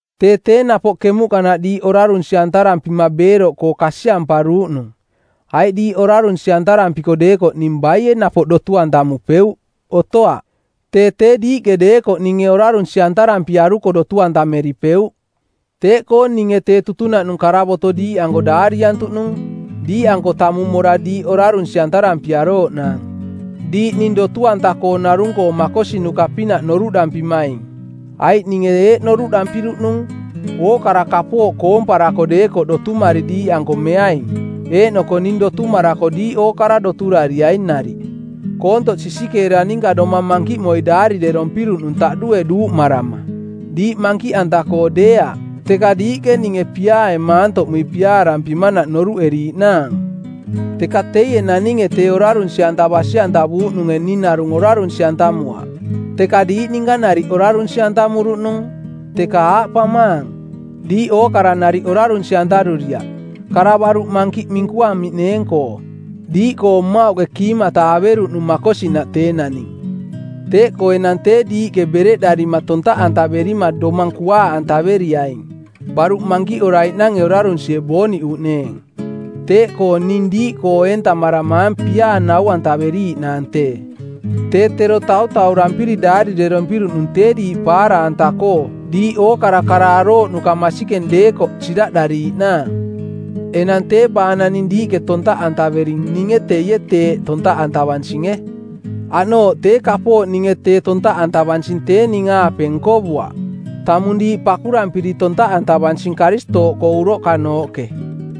Tee tee napoꞌ kemuꞌkanaꞌ diiꞌ orarunsi-antarampima beeroꞌkoo kasiamparuuꞌnung. Aiꞌ diiꞌ orarunsi-antarampiko deekoꞌ ning baie napoꞌ dotu-antamupeuꞌ? Otoaꞌ. Tee tee diiꞌke deekoꞌ ninge orarunsi-antarampiaruko dotu-antameripeuꞌ. Teeꞌkoo ninge tee tutunaꞌnung karavoto diiꞌanko daariantuꞌnung diiꞌanko tamung mora diiꞌ orarunsi-antarampiarooꞌnaang, diiꞌ ning dotu-anta-koo narung-koo makosinuka-pinaꞌ noruꞌdampimaing. Aiꞌ ninge eeꞌ noruꞌdampiruꞌnung, ookara kapooꞌ koomparako deekoꞌ dotumari diiꞌanko meaing, eeꞌnoko ning dotumarako diiꞌ ookara doturariai nariꞌ. Koontoꞌ sisikeera ninka domang mankiꞌmoi daarirerompiruꞌnung taꞌdue duuꞌmarama. Diiꞌ mankiꞌanta-koo deeaꞌ, teka diiꞌke ninge piaae maantoꞌmui piaarampimanaꞌ noruꞌeriiꞌnaang. Teka teie naninge tee orarunsi-anta basi-antavuuꞌnunge ning narung orarunsi-antamuaꞌ, teka diiꞌ ninka nariꞌ orarunsi-antamuruꞌnung, teka aaꞌpamaang, diiꞌ ookara nariꞌ orarunsi-antaruriaꞌ, kara baruꞌ mankiꞌ minkuamiꞌneeng-koo. Diiꞌkoo mmauꞌke kiimata averuꞌnung makosinaꞌ tee naning. Teeꞌkoo enang tee diiꞌke bereꞌdarima tontaꞌantaverima domang kuaaꞌantaveriaing, baruꞌ mankiꞌoraiꞌnange orarunsie booniꞌuꞌneeng. Teeꞌkoo ning diiꞌkoo eentamarang piaa nau-antaveriiꞌnaang tee. Tee tero tautaurampiri daarirerompiruꞌnung tee diiꞌ paara-anta-koo diiꞌ ookara kara arooꞌnuka masikeng deekoꞌ siraꞌdariiꞌnaang. Enang tee baa naning diiꞌke tontaꞌantavering ninge teie teeꞌ tontaꞌantavansinge. Aꞌnooꞌ tee kapooꞌ ninge tee tontaꞌantavansing tee ning-aape nkovuaꞌ, tamung diiꞌ pakurampiri tontaꞌantavansing Karistooꞌkoo uroꞌkanooꞌke.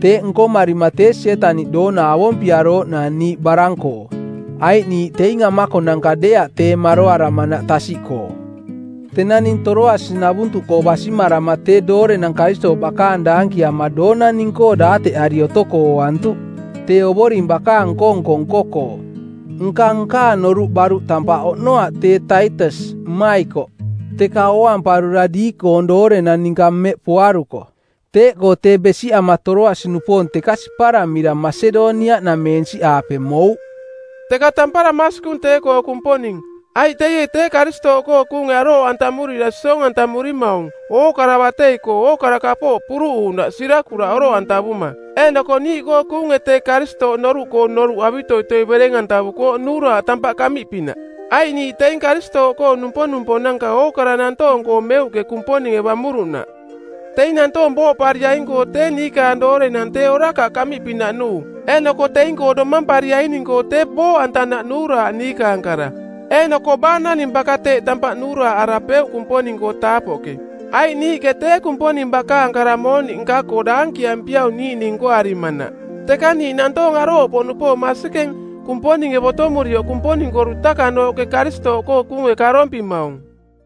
Teeꞌ nkomarima tee Sietaniꞌ doona avompiarooꞌnaang niiꞌ barang-koo, aiꞌ niiꞌ teing amakonanka deeaꞌ tee maroaramanaꞌ tasiꞌkoo. Tenang ning Toroasi-navuntuꞌkoo basimarama tee doorenang Karistooꞌ bakaang daankiama doona ning-koo daateꞌari otoko ooantuꞌ tee Ovoring bakaang nko-nko nko-koo. Nka nkaang noruꞌ baruꞌ tampaꞌ oꞌnoaꞌ tee Taitas, mmaikoꞌ, teka ooamparura diiꞌkoong doorenang ninka mmeꞌ poaruko. Teeꞌkoo tee besiꞌama Toroasi-nupoong teka siparamira Masedoniaꞌnameensiꞌaape mouꞌ. Teka tampara masikung tee-koo Kumponing, aiꞌ teie tee Karistooꞌkoo kuunge arooꞌantamurira siong-antamurimaung ookara batei-koo ookara kapooꞌ puruꞌuuꞌnaꞌ sirakuraꞌ oroꞌantavuma. Eeꞌnoko niiꞌkoo kuunge tee Karistooꞌ noruꞌkoong noruꞌ avitoitoi bereng-antavukooꞌ nuuraaꞌ tampaꞌ kaꞌmiꞌpinaꞌ. Aiꞌ niiꞌ teing Karistooꞌkoong numponuponanka ookara nantoong-koo meuꞌke Kumponinge bamuruꞌnaꞌ; Teing nantoong booꞌpariaing-koo tee niikaang doorenang tee orakaꞌ kaꞌmiꞌpinaꞌ nuu, eeꞌnoko teing-koo domampariaining-koo tee booꞌantanaꞌ nuuraaꞌ niikaang kara. Eeꞌnoko baa naning baka teeꞌ tampaꞌ nuuraaꞌarapeuꞌ Kumponing-koo taapoꞌke? Aiꞌ niiꞌke tee Kumponing bakaang kara mooniꞌ nka-koo daankiampiaung niiꞌning nkoarimanaꞌ, teka niiꞌ nantoong arooꞌpoꞌnupoong masikeng, Kumponinge botomurioꞌ Kumponing-koo dutakanooꞌke Karistooꞌkoo kuunge karompimaung.